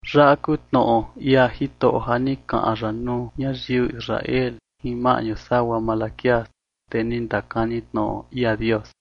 Yaꞌa kuu tnoꞌo ia Jitoꞌo ja ni kaꞌan ya nuu ñayiu Israel jin maꞌñu sagua Malaquías, tee ni ndakani tnoꞌo ia Dios.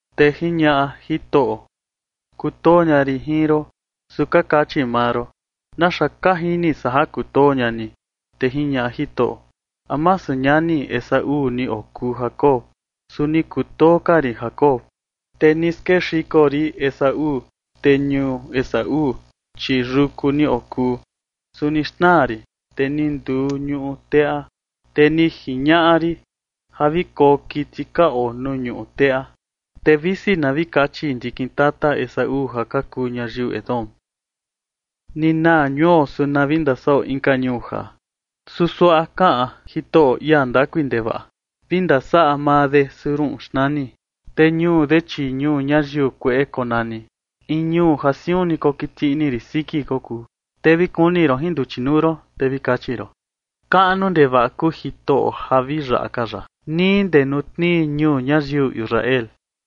Te jiñaꞌa Jitoꞌo: “Kutoo ña rin jin ron”, su ka kachi maa ron: “¿Naxa ka jini san ja kutoo ña ni?” Te jiñaꞌa Jitoꞌo: “¿A masu ñani Esaú ni okuu Jacob? Su ni kutoo ka rin Jacob, te ni skexiko rin Esaú. Te ñuu Esaú, chi yuku ni okuu, su ni xnaa rin, te ni nduu ñuꞌu teꞌa, te ni jiñaꞌa rin ja vi koo kiti ka oo nuu ñuꞌu teꞌa.” Te visi na vi kachi ndikin tata Esaú ja ka kuu ñayiu Edom: “Ni naa ñuo, su na vi ndasaꞌo inka ñuu jaa”, su suaꞌa kaꞌan Jitoꞌo, ia ndakui ndevaꞌa: “Vi ndasaꞌa maa de, su ruꞌun xnani. Te ñuu de, chi ñuu ñayiu kueꞌe konani, in ñuu ja siun ni kokiti ini rin siki kokuu.” Te vi kuni ron jin nduchi nuu ron, te vi kachi ron: “Kaꞌnu ndevaꞌa kuu Jitoꞌo ja vi yaꞌa ka ya nii ndee nuu tnii ñuu ñayiu Israel”.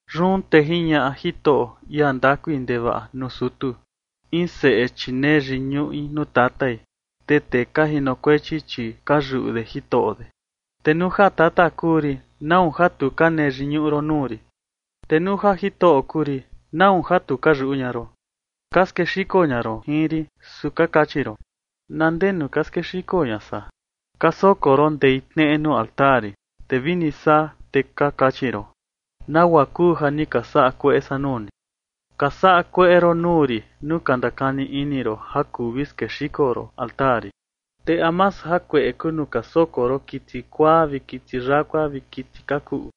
Yun te jiñaꞌa Jitoꞌo, ia ndakui ndevaꞌa, nuu sutu: “In seꞌe, chi nee yiñuꞌi nuu tatai, te tee ka jinokuechi, chi ka yuꞌu de jitoꞌo de. Te nuu ja tata kuu rin, ¿nau ja tu ka nee yiñuꞌu ron nuu rin? Te nuu ja jitoꞌo kuu rin, ¿nau ja tu ka yuꞌu ña ron? Ka skexiko ña ron jin rin, su ka kachi ron: ¿Na ndenu ka skexiko ña san? Ka soko ron ndei tneꞌe nuu altar rin. Te vini saa, te ka kachi ron: ¿Nagua kuu ja ni ka saꞌa kueꞌe san nuu ni? Ka saꞌa kueꞌe ron nuu rin nuu ka ndakani ini ron ja kuu vi skexiko ron altar rin. ¿Te a masu jakueꞌe kuu nuu ka soko ron kiti kuaa vi kiti yakua vi kiti ka kuꞌu?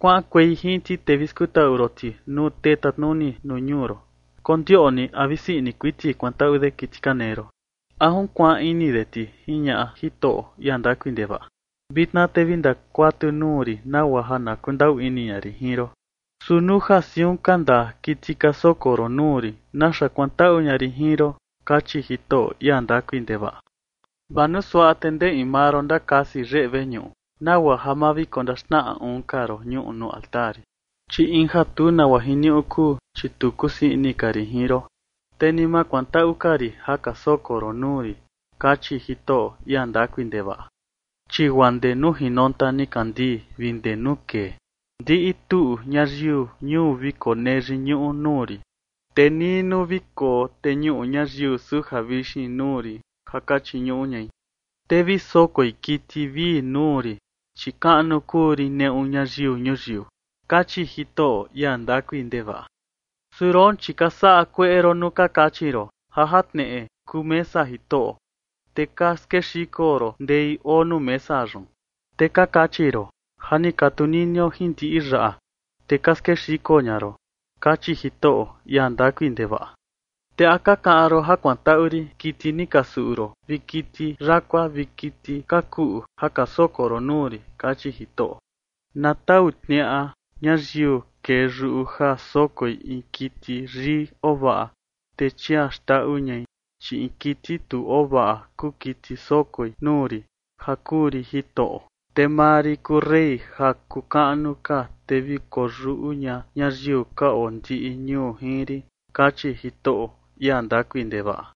Kuaꞌankuei jin ti, te vi skutaꞌu ron ti nuu tee tatnuni nuu ñuu ron. Kondioꞌni a vi sii ini kuiti kuantaꞌu de kiti ka nee ron, ¿a junkuaan ini de ti?”, jiñaꞌa Jitoꞌo, ia ndakui ndevaꞌa. “Vitna te vi ndakuatu nuu rin nagua ja na kundaꞌu ini ña rin jin ron. Su nuu ja siun ka ndaa kiti ka soko ron nuu rin, ¿naxa kuantaꞌu ña rin jin ron?”, kachi Jitoꞌo, ia ndakui ndevaꞌa. “Vaa nuu suaꞌa, te ndee in maa ron ndakasi yeꞌe veñuꞌu, nagua ja ma vi kondaxnaꞌa uun ka ron ñuꞌu nuu altar rin, chi in ja tu nagua jiniuꞌu kuu, chi tu kusii ini ka rin jin ron, te ni ma kuantaꞌu ka rin ja ka soko ron nuu rin”, kachi Jitoꞌo, ia ndakui ndevaꞌa. “Chi guaa ndee nuu jinonta nikandii vi ndee nuu kee, ndiꞌi tuꞌu ñayiu ñuu vi konee yiñuꞌu nuu rin, te nii nuu vi koteñuꞌu ñayiu suja vixin nuu rin ja ka chiñuꞌu ñai, te vi sokoi kiti vii nuu rin, chi kaꞌnu kuu rin neꞌu ñayiu ñuyiu”, kachi Jitoꞌo, ia ndakui ndevaꞌa. “Su roon, chi ka saꞌa kueꞌe ron nuu ka kachi ron: Ja jatneꞌe kuu mesa Jitoꞌo, te ka skexiko ron ndei oo nuu mesa yun. Te ka kachi ron: Ja ni ka tuninio jin ndiꞌi yaꞌa, te ka skexiko ña ron”, kachi Jitoꞌo, ia ndakui ndevaꞌa. “Te ¿a ka kaꞌan ron ja kuantaꞌu rin kiti ni ka suꞌu ron vi kiti yakua vi kiti ka kuꞌu ja ka soko ron nuu rin?”, kachi Jitoꞌo. “Na tau tniaꞌa ñayiu kee yuꞌu ja sokoi in kiti yii oo vaꞌa, te chia xndaꞌu ñai, chi in kiti tu ovaꞌa kuu kiti sokoi nuu rin ja kuu rin Jitoꞌo. Te maa rin kuu rey ja kuu kaꞌnu ka, te vi koyuꞌu ña ñayiu ka oo ndiꞌi ñuu jin rin”, kachi Jitoꞌo, ia ndakui ndevaꞌa.